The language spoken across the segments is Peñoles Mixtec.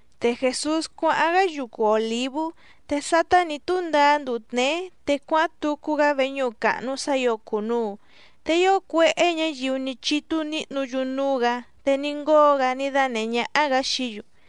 Te Jèsús cuáháⁿ‑gá yucu Òlívú. Te sátá nǐ túndaá nduu tněé, te cuáháⁿ tucu‑gá veñúhu càhnu sá ǐo cùnuu. Te ío cuéhé ñǎyiu ní chítú níhnǔ‑yu núú‑gǎ, te ní ngóo‑gá ní dánèhé ñáhá‑gǎ xií‑yu.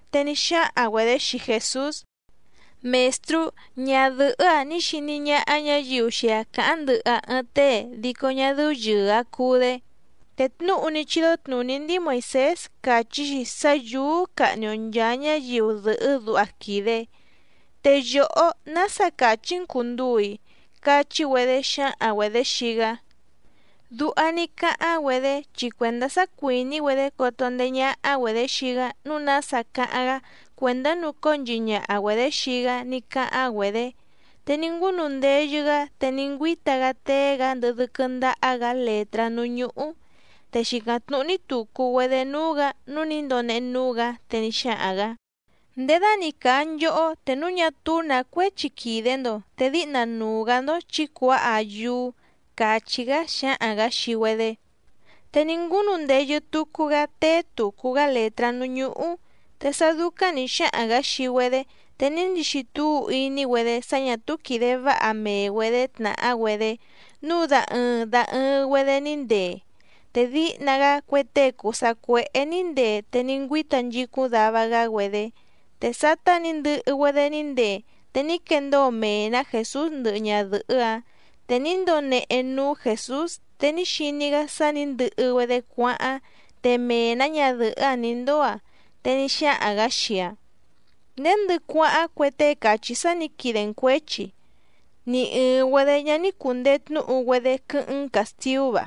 Te ní xáhaⁿ‑güedě xii Jèsús: —Mèstrú, ñadɨ̀hɨ́‑a ní xiní ñáhá ñǎyiu xii‑aⁿ càháⁿ ndɨhɨ‑aⁿ ɨɨⁿ tée dico ñá dɨ́ú yɨ̀ɨ‑aⁿ cuu‑dé. Te tnúhu ní chídó tnùní ndíi Moìsés càchí‑xi sá yǔú cahni‑o nchàa ñáyiu dɨ̀hɨ́ duha quìde. Te yòhó, ¿nása càchí‑n cùnduu‑i? —cachí‑güedé xǎhaⁿ‑güedě xii‑gá. Duha ní cáháⁿ‑güedé chi cuèndá sá cuìní‑güedé coto ndeé ñáhá‑güedě xii‑gá nǔu nása cáháⁿ‑gá cuèndá nùcóo nchihi ñaha‑güedě xii‑gá ní cáháⁿ‑güedě. Te ní ngúnu ndeyɨ‑gá te ní ngüíta‑gá téé‑gǎ ndɨhɨ dɨ́quɨ́ ndáhá‑gǎ lètrá núú ñúhú. Te xìcáⁿ tnúhú‑ní tùcu‑güedé núú‑gǎ nǔu ní ndonehe núú‑gǎ, te ní xáhaⁿ‑gǎ: —Ndědani càa nchohó te núu ñá túú nǎ cuéchi quìde‑ndo te díhna nuu‑gǎ‑ndó chǐ cuǎha‑aⁿ yúú —càchí‑gá xáhaⁿ‑gǎ xii‑güedé. Te ní ngúnu ndeyɨ tucu‑gá téé tùcu‑gá lètrá núú ñúhú. Te sá dúcáⁿ nǐ xáhaⁿ‑gǎ xii‑güedé te ní ndixi túu iní‑güedé sá ñà túú quìde váha mee‑güedě tnàhá‑güedé, núu da ɨɨⁿ da ɨɨⁿ‑güedé ní ndee, te díhna‑gá cue tée cùu sacuéhé nǐ ndee te ní ngüíta nchicúⁿ dava‑gá‑güedé. Te sátá nǐ ndɨhɨ‑güedé ní ndee, te ní quendóo mee‑nǎ Jèsús ndɨhɨ ñadɨ̀hɨ́‑áⁿ. Te ní ndonehe núú Jèsús te ní xiní‑gá sá nǐ ndɨhɨ‑güedé cuáháⁿ te mee‑nǎ ñadɨ̀hɨ́‑áⁿ nǐ ndóo‑aⁿ, te ní xáhaⁿ‑gǎ xii‑aⁿ: —¿Nděndɨ cuáháⁿ cue tée càchí sá nǐ quide‑n cuěchi? ¿Ni ɨ̀ɨⁿ‑güedé ñá ní cùndee tnúhu‑güedé quɨ́hɨ́ⁿ‑n càstiú‑va?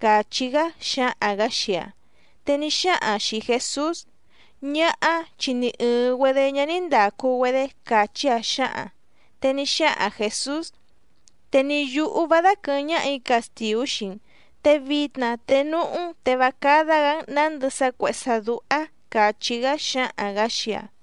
—càchí‑gá xáhaⁿ‑gǎ xii‑aⁿ. Te ní xáhaⁿ‑aⁿ xìi Jesús: —Ñáhá, chi ni ɨ̀ɨⁿ‑güedé ñá ní ndàcu‑güedé —càchí‑aⁿ xǎhaⁿ‑aⁿ. Te ní xáhaⁿ Jèsús: —Te ni yǔhú vá dáquɨ̀hɨ́ⁿ ñáhà‑í castìú xii‑n. Te vitna te núhú‑n te vá cádá‑gǎ‑n nǎndɨ sá cuèhé sá dúhá —càchí‑gá xáhaⁿ‑gǎ xii‑aⁿ.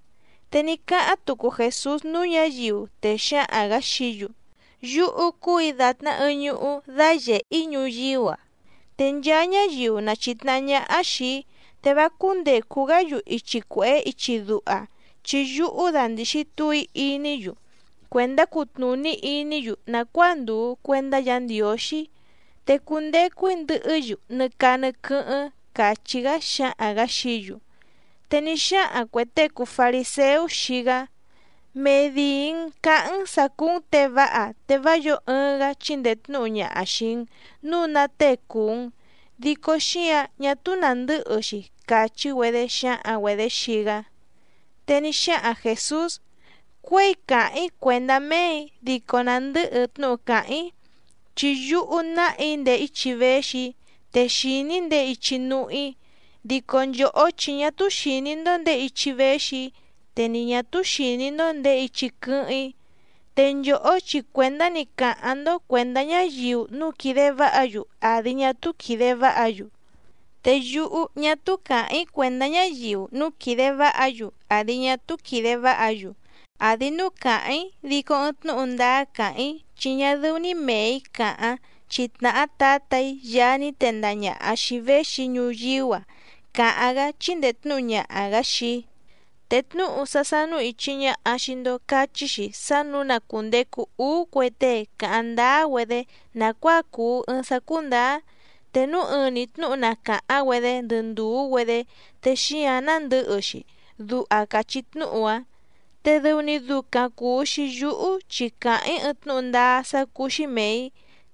Te ní cáháⁿ tucu Jèsús núú ñǎyiu, te xáhaⁿ‑gǎ xií‑yu: —Yúhú cúù‑í dàtná ɨɨⁿ ñuhú dáyèhe‑í ñuyíú‑a, te nchaa ñáyiu na chìtnahá ñáhá xìi‑í, te vá cúndècu‑gá‑yu ichi cuèhé ichi duha, chi yúhú dandìxi túu‑í iní‑yu cuèndá cutnùní iní‑yu nàcuáa ndùu cuendá Yǎ Ndiǒxí, te cundecu‑í ndɨhɨ́‑yu nɨ caa nɨ quɨ́hɨ́ⁿ —càchí‑gá xáhaⁿ‑gǎ xií‑yu. Te ní xáhaⁿ cuè tée cùu fariséú xii‑gá: —Medìi‑n caháⁿ‑n sǎ cúú‑n těe váha, te vá yǒo ɨɨⁿ‑gá chíndèe tnúhu ñaha xìi‑n núu ná tée cùu‑n, dico xíǎⁿ ñá túú nàndɨ́hɨ‑xi —càchí‑güedé xǎhaⁿ‑güedě xii‑gá. Te ní xáhaⁿ Jèsús: —Cuěi càháⁿ‑í cuèndá méè‑í dico nàndɨ́hɨ tnúhu càháⁿ‑í. Chi yúhú nàha‑í ndèé ichi véxi‑í, te xìní‑í ndèé ichi núhú‑í, dico nchòhó chi ñá túú xìní‑ndó ndèé ichi véxi‑í, te ni ñà túú xìní‑ndó ndèé ichi quɨ́hɨ́ⁿ‑í. Te nchòhó chi cuèndá‑ni càháⁿ‑ndó cuèndá ñáyiu núu quìde váha‑yu àdi ñá túú quìde váha‑yu. Te yúhú ñá túú càháⁿ‑í cuèndá ñáyiu núu quìde váha‑yu àdi ñá túú quìde váha‑yu. Àdi núu càháⁿ‑í dico ɨɨⁿ tnúhu ndáá càháⁿ‑í chi ñá dɨ́ú‑ní mèe‑í càháⁿ, chi tnàhá Tǎtà‑í Yaá ní tendaha ñàha xii‑í véxi‑í ñuyíú‑a càháⁿ‑gá chíndèe tnúhu ñaha‑gǎ xii‑í. Te tnúhu sá sánú ìchi ñaha xii‑ndo cachí‑xi sá nǔu na cùndecu úú cue tée cáháⁿ ndáá‑güedé nàcuáa cùu ɨɨⁿ sá cúndǎá, te núu ɨɨⁿ‑ni tnǔhu na càháⁿ‑güedé ndɨ ndùú‑güedé te xíǎⁿ nándɨ̌hɨ‑xi, duha càchí tnúhu‑áⁿ. Te dɨu‑ni ducaⁿ cùu‑xi yúhú chi càháⁿ‑í ɨɨⁿ tnúhu ndáá sá cúú‑xí mèe‑í,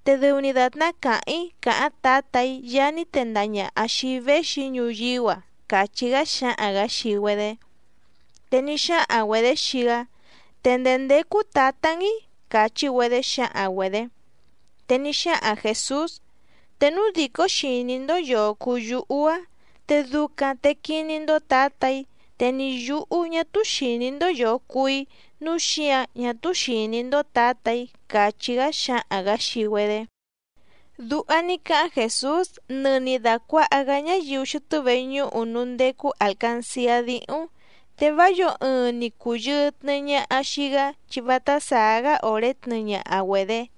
te dɨu‑ni dàtná càháⁿ‑í càháⁿ Tǎtà‑í Yaá ní tendaha ñàha xii‑í véxi‑í ñuyíú‑a —càchí‑gá xáhaⁿ‑gǎ xii‑güedé. Te ní xáhaⁿ‑güedě xii‑gá: —¿Te ndèé ndécú Tǎtá‑n‑í? —càchí‑güedé xǎhaⁿ‑güedě. Te ní xáhaⁿ Jèsús: —Te núu dìcó xìní‑ndó yòo cuu yúhú‑á te ducaⁿ te quiní‑ndó Tǎtà‑í. Te ni yǔhú ñá túú xìní‑ndó yòo cuu‑í nǔu xíǎⁿ ñá túú xìní‑ndó Tǎtà‑í —càchí‑gá xáhaⁿ‑gǎ xii‑güedé. Duha ní cáháⁿ Jèsús nɨni dàcuaha‑gá ñáyiu xɨtɨ́ veñúhu núú ndécú àlcanciá díhúⁿ. Te vá yǒo ɨɨⁿ ni cùyɨɨ tnɨɨ ñaha xii‑gá chi vátá sàá‑gá òré tnɨɨ ñaha‑güedě.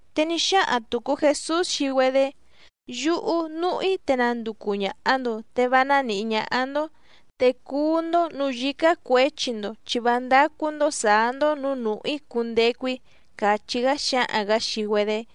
Te ní xáhaⁿ tùcu Jesús xii‑güedé: —Yúhú núhú‑í te nanducu ñàha‑ndo te vá nánǐhí ñáhá‑ndó, te cuú‑ndó nǔú yǐcá cuěchi‑ndo, chi vá ndácú‑ndó sǎá‑ndó nǔú nùhú‑í cundecu‑í —càchí‑gá xáhaⁿ‑gǎ xii‑güedé.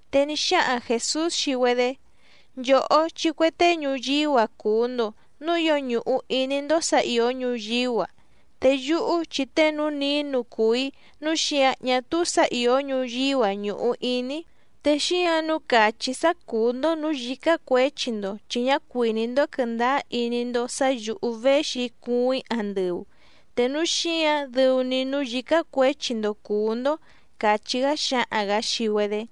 Te ní xáhaⁿ Jèsús xii‑güedé: —Nchòhó chi cue tée ñuyíú‑a cùu‑ndo, núu ío ñùhu iní‑ndó sǎ ìó ñuyíú‑a. Te yúhú chi tée núú nǐnu cùu‑í nǔu xíǎⁿ ñá túú sǎ ìó ñuyíú‑a ñùhu iní‑í. Te xíǎⁿ nǔu càchí‑í sá cùú‑ndó nǔú yǐcá cuěchi‑ndo, chi ñá cuìní‑ndó quɨ̀ndáá iní‑ndó sǎ yǔhú véxi cuuⁿ‑í andɨu, te núu xíǎⁿ dɨu‑ni núú yǐcá cuěchi‑ndo cùú‑ndó —càchí‑gá xáhaⁿ‑gǎ xii‑güedé.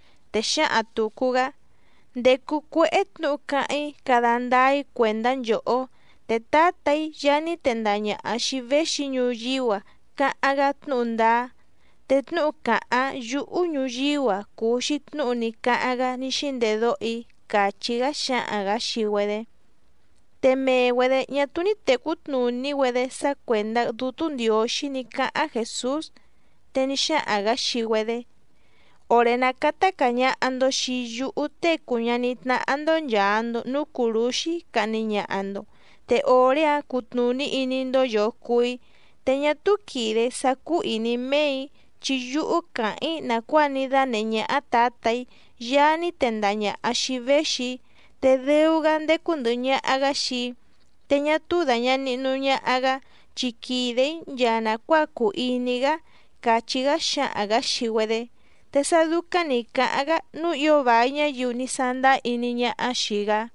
Te xǎhaⁿ tùcu‑gá: —Ndècu cuéhé tnǔhu cáháⁿ‑í cada ndáá‑í cuèndá nchòhó. Te Tǎtà‑í Yaá ní tendaha ñàha xii‑í véxi‑í ñuyíú‑a càháⁿ‑gá tnúhu ndáá, te tnúhu càháⁿ yúhú ñuyíú‑a cùu‑xi tnúhu ní cáháⁿ‑gá ní xíndedóho‑í —càchí‑gá xáhaⁿ‑gǎ xii‑güedé. Te mee‑güedě ñá túú ní tècú tnùní‑güedé sá cuèndá Dútú Ndiǒxí ní cáháⁿ Jèsús. Te ní xáhaⁿ‑gǎ xii‑güedé: —Òré ná cátá càa ñaha‑ndo xii yúhú Tée cùu ñaní tnáhá‑ndó nchàa‑ndo núú cùrúxí cahni ñaha‑ndo, te òré‑áⁿ cutnùní iní‑ndó yòo cuu‑í, te ñá túú quìde‑í sá cúú ìní méè‑í, chi yúhú càháⁿ‑í nàcuáa ní dánèhé ñáhá Tǎtà‑í Yaá ní tendaha ñàha xii‑í véxi‑í. Te dɨu‑gá ndécú ndɨ̀hɨ ñaha‑gá xii‑í, te ñá túú dàña nihnu ñaha‑gá chi quìde‑í nchaa nàcuáa cùu iní‑gá —càchí‑gá xáhaⁿ‑gǎ xii‑güedé. Te sá dúcáⁿ nǐ cáháⁿ‑gá nǔu ío vài ñáyiu ní sándáá iní ñáhá xìi‑gá.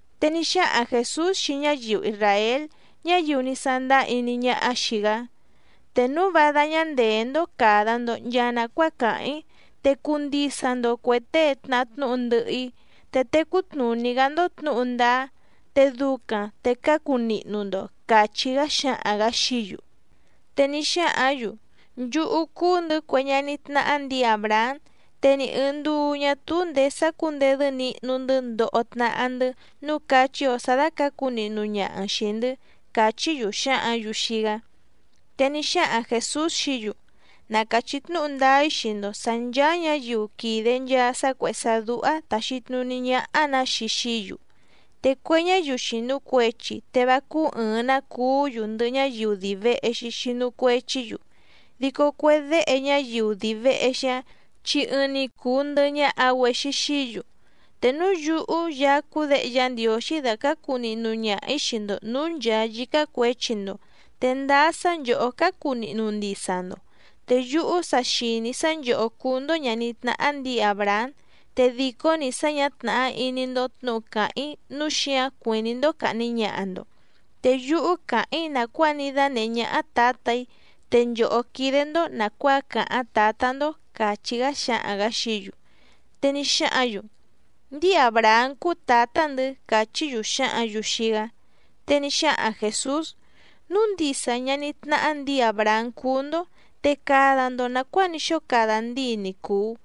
Te ní xáhaⁿ Jèsús xii ñáyiu isràél ñáyiu ní sándáá iní ñáhá xìi‑gá: —Te núu vá dáñá ndèé‑ndó càda‑ndo nchaa nacuáa càháⁿ‑í, te cuu ndisa‑ndo cuè tée tnàhá tnúhu ndɨhɨ‑í, te tecú tnùní‑gá‑ndó tnǔhu ndáá, te ducaⁿ te cácu nihnu‑ndo —càchí‑gá xáhaⁿ‑gǎ xií‑yu. Te ní xáhǎⁿ‑yu: —Nchúhú cúú‑ndɨ̌ cue ñaní tnáhá ndǐi Àbrahám, te ni ɨ̀ɨⁿ nduu ñá túú ndèé sácǔndedɨ́ nihnu‑ndɨ́ ndoho tnahá‑ndɨ́ nǔu cáchí‑ǒ sá dàcácu nihnu ñaha‑n xìi‑ndɨ́ —càchí‑yu xǎhǎⁿ‑yu xii‑gá. Te ní xáhaⁿ Jèsús xií‑yu: —Na càchí tnúhu ndáá‑í xii‑ndo sǎ nchàa ñáyiu quìde nchaa sá cuèhé sá dúhá tàxi tnuní ñáhá‑nǎ‑xi xií‑yu. Te cue ñáyiu xìnu cuechi te vá cúú ɨ̀ɨⁿ‑ná cuú‑yu ndɨhɨ ñáyiu dii vèhe‑xi xinu cuechí‑yu, dico cue déhe ñáyiu dii vèhe‑xi‑áⁿ chi ɨɨⁿ‑ni cùu ndɨhɨ ñaha‑güexi xií‑yu. Te núu yúhú Yaá cúú Děhe Yá Ndiǒxí dàcácu nihnu ñaha‑ǐ xii‑ndo nǔú nchàa yícá cuěchi‑ndo, te ndáá sá nchòhó cácu nihnu ndisa‑ndo. Te yúhú sa xìní‑í sá nchòhó cúú‑ndó ñàní tnáhá ndǐi Àbrahám, te dìcó‑ni sá ñǎ tnàhá iní‑ndó tnǔhu càháⁿ‑í nǔu xíǎⁿ cuìní‑ndó càhni ñaha‑ndo. Te yúhú càháⁿ‑í nàcuáa ní dánèhé ñáhá Tǎtà‑í, te nchòhó quídé‑ndó nàcuáa càháⁿ tǎtá‑ndó —càchí‑gá xáhaⁿ‑gǎ xií‑yu. Te ní xáhǎⁿ‑yu: —Ndíi Àbrahám cúú tǎtá‑ndɨ̌ —càchí‑yu xǎhǎⁿ‑yu xii‑gá. Te ní xáhaⁿ Jèsús: —Núu ndisa ñaní tnáhá ndǐi Àbrahám cúú‑ndó, te cada‑ndo nàcuáa ní xóo cada ndíi ni cùu.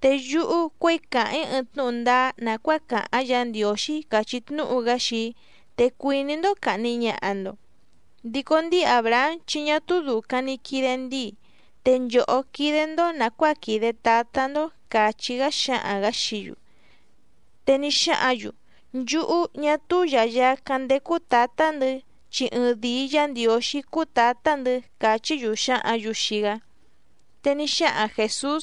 Te yúhú cuěi càháⁿ‑í ɨɨⁿ tnúhu ndáá nàcuáa càháⁿ Yǎ Ndiǒxí càchí tnúhu‑gá xii‑í, te cuìní‑ndó càhni ñaha‑ndo. ¡Dico ndíi Àbrahám chi ñá túú dùcaⁿ ni quide ndíi! Te nchòhó quídé‑ndó nàcuáa quìde tátá‑ndó —càchí‑gá xáhaⁿ‑gǎ xií‑yu. Te ní xáhǎⁿ‑yu: —Nchúhú, ñá túú yàyacáⁿ ndécú tǎtá‑ndɨ̌, chi ɨɨⁿdìi Yá Ndiǒxí cúú tǎtá‑ndɨ̌ —càchí‑yu xǎhǎⁿ‑yu xii‑gá. Te ní xáhaⁿ Jèsús: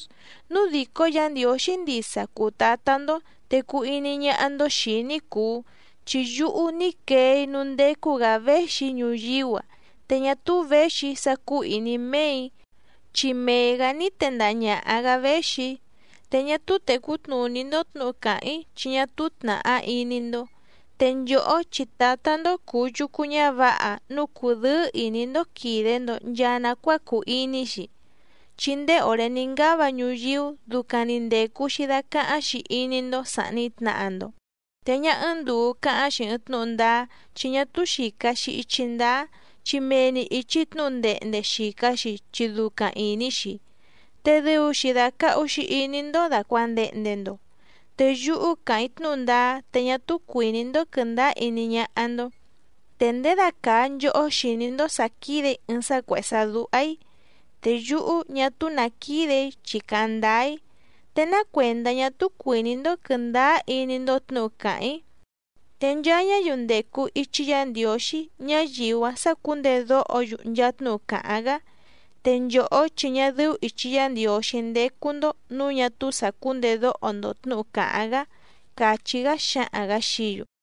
—Núu dìcó Yǎ Ndiǒxí ndisa cùu Tátá‑ndó te cuu iní ñáhá‑ndó xìi‑í ní cùu chi yúhú ní quee‑í núú ndécú‑gǎ véxi‑í ñuyíú‑a. Te ñá túú věxi‑í sá cúú ìní méè‑í, chi mee‑gǎ ní tendaha ñàha‑gá véxi‑í. Te ñá túú tècú tnùní‑ndó tnǔhu càháⁿ‑í chi ñá túú tnàhá iní‑ndó. Te nchòhó chi tǎtá‑ndó cùu yucu ñávǎha núu cùdɨ́ɨ́ ìní‑ndó quìde‑ndo nchaa nacuáa cùu iní‑xi, chi ndéé òré ní ngáva ñuyíú ducaⁿ‑ni ndècu‑xi dacáháⁿ‑xi iní‑ndó sàhni tnaha‑ndo. Te ñá ɨ́ɨ́ⁿ ndùu cáháⁿ‑xi ɨɨⁿ tnúhu ndáá chi ñá túú xìca‑xi ichi ndáá, chi mee‑ni ìchi tnúhu ndehnde xìca‑xi chi ducaⁿ ìní‑xi. Te dɨu‑xi dàcahu‑xi iní‑ndó dàcuandehnde‑ndo. Te yúhú càháⁿ‑í tnúhu ndáá te ñá túú cuìní‑ndó quɨ̀ndáá iní ñáhá‑ndó. ¿Te ndědacàa nchohó xìní‑ndó sǎ quídè‑í ɨɨⁿ sá cuèhé sá dúhá‑í?, te yúhú ñá túú nǎ quídè‑í chi càháⁿ ndáá‑í, ¿te ná cuèndá ñá túú cuìní‑ndó quɨ̀ndáá iní‑ndó tnǔhu càháⁿ‑í? Te nchaa ñáyiu ndècu ichi Yá Ndiǒxí, ñáyiu‑áⁿ sácǔndedóho‑yu nchaa tnúhu càháⁿ‑gá. Te nchòhó chi ñá dɨ́ú ìchi Yá Ndiǒxí ndécú‑ndó nǔu ñá túú sàcúndedóho‑ndo tnǔhu càháⁿ‑gá —càchí‑gá xáhaⁿ‑gǎ xií‑yu.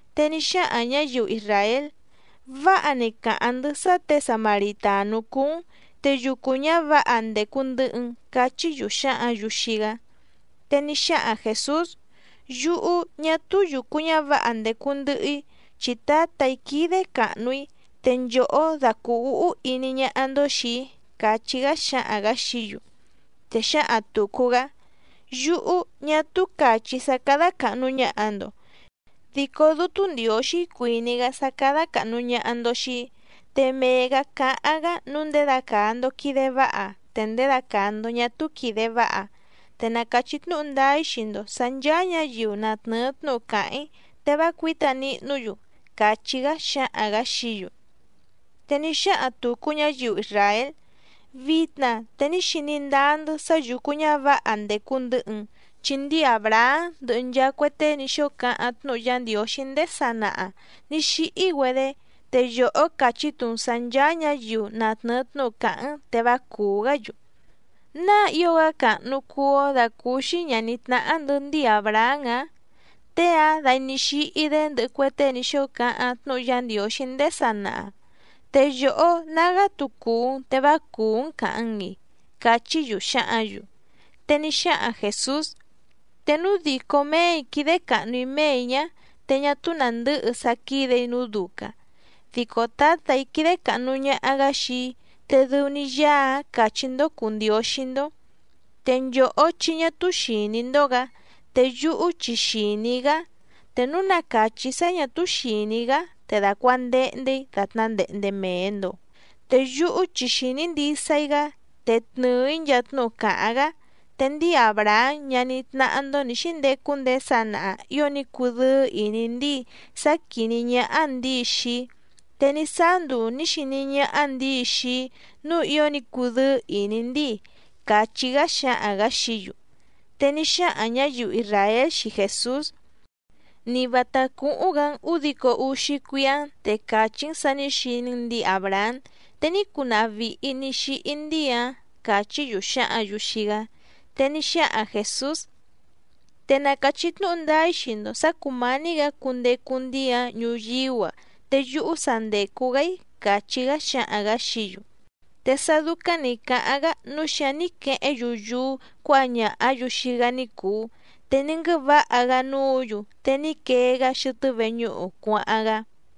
Te ní xáhaⁿ ñǎyiu isràél: —Váha‑ni càháⁿ‑ndɨ́ sá těe samaritànú cúú‑n, te yucu ñǎvǎha ndècu ndɨhɨ‑n —cachí‑yu xǎhǎⁿ‑yu xii‑gá. Te ní xáhaⁿ Jèsús: —Yúhú, ñá túú yùcu ñávǎha ndècu ndɨhɨ‑í, chi Tǎtà‑í quídé càhnu‑í, te nchòhó da cùu úhú iní ñáhá‑ndó xìi‑í —càchí‑gá xáhaⁿ‑gǎ xií‑yu. Te xǎhaⁿ tùcu‑gá: —Yúhú, ñá túú càchí‑í sá cádá càhnu ñaha‑ndo, dico Dútú Ndiǒxí cuìní‑gá sá cádá càhnu ñaha‑ndo xii‑í. Te mee‑gǎ cáháⁿ‑gá nǔu ndědacàa‑ndo quide váha, te ndědacàa‑ndo ñá túú quìde váha. Te na càchí tnúhu ndáá‑í xii‑ndo sǎ nchàa ñáyiu na tnɨ̀ɨ tnúhu càháⁿ‑í te vá cuǐta nihnú‑yu —càchí‑gá xáhaⁿ‑gǎ xií‑yu. Te ní xáhaⁿ tùcu ñáyiu isràél: —Vitna te ní xiní ndáá‑ndɨ́ sá yùcu ñávǎha ndècu ndɨhɨ‑n, chi ndíi Àbrahám ndɨhɨ nchaa cue tée ní xóo cáháⁿ tnúhu Yá Ndiǒxí ndéé sanaha nǐ xíhí‑güedé, te yòhó càchí‑tu‑n sǎ ncháá ñǎyiu na tnɨ̀ɨ tnúhu càháⁿ‑n te vá cùú‑gá‑yu. ¿Náa ío‑gá càhnu cuu‑ó dàcúúxí ñàní tnáhá‑ndɨ̌ ndíi Àbrahám‑ǎⁿ? Tée‑áⁿ dai ní xíhí‑dé ndɨhɨ cue tée ní xóo cáháⁿ tnúhu Yá Ndiǒxí ndéé sanaha. ¿Te yòhó nágá‑tu cùu‑n te vá cùú‑n càhaⁿ‑n‑i? —cachí‑yu xǎhǎⁿ‑yu. Te ní xáhaⁿ Jèsús: —Te núu dìcó méè‑í quídé càhnu‑í méè‑í ñá, te ñá túú nàndɨ́hɨ sá quídè‑í nǔu ducaⁿ. Dico Tǎtà‑í quídé càhnu ñaha‑gá xii‑í, te dɨu‑ni Yaá‑áⁿ càchí‑ndó cùu Ndióxí‑ndó. Te nchòhó chi ñá túú xìní‑ndó‑gǎ. Te yúhú chi xìní‑í‑gá. Te núu na càchí‑í sá ñà túú xìní‑í‑gá te dàcuandehnde‑í dàtná ndehnde mèe‑ndo. Te yúhú chi xìní ndisa‑í‑gá te tnɨ̀ɨ‑í nchaa tnúhu càháⁿ‑gá. Te ndíi Àbrahám ñaní tnáhá‑ndó nǐ xíndecu ndéé sanaha ío ní cudɨ́ɨ́ ìní ndíi sá quìní ñáhá ndǐi xii‑í, te ní sáá nduu nǐ xiní ñáhá ndǐi xii‑í nǔu ío ní cudɨ́ɨ́ ìní ndíi —càchí‑gá xáhaⁿ‑gǎ xií‑yu. Te ní xáhaⁿ ñǎyiu isràél xii Jèsús: —Ni vǎtá cúhúⁿ‑gǎ‑n ǔdico úxí cuíá‑n te càchí‑n sǎ nǐ xiní‑n ndǐi Àbrahám, te ní cunaha vìhi ní xíhí ndíi‑áⁿ —càchí‑yu xǎhǎⁿ‑yu xii‑gá. Te ní xáhaⁿ Jèsús: —Te na càchí tnúhu ndáá‑í xii‑ndo sǎ cùmání‑gǎ cundecu ndíi‑áⁿ ñuyíú‑a te yúhú sa ndècu‑gá‑í —càchí‑gá xáhaⁿ‑gǎ xií‑yu. Te sá dúcáⁿ nǐ cáháⁿ‑gá nǔu xíǎⁿ ní quehéⁿ‑yu yúú cuǎha ñàhá‑yu xii‑gá ní cùu, te ní nguɨ́vǎha‑gá núǔ‑yu te ní quee‑gá xɨtɨ́ veñúhu cuáháⁿ‑gá.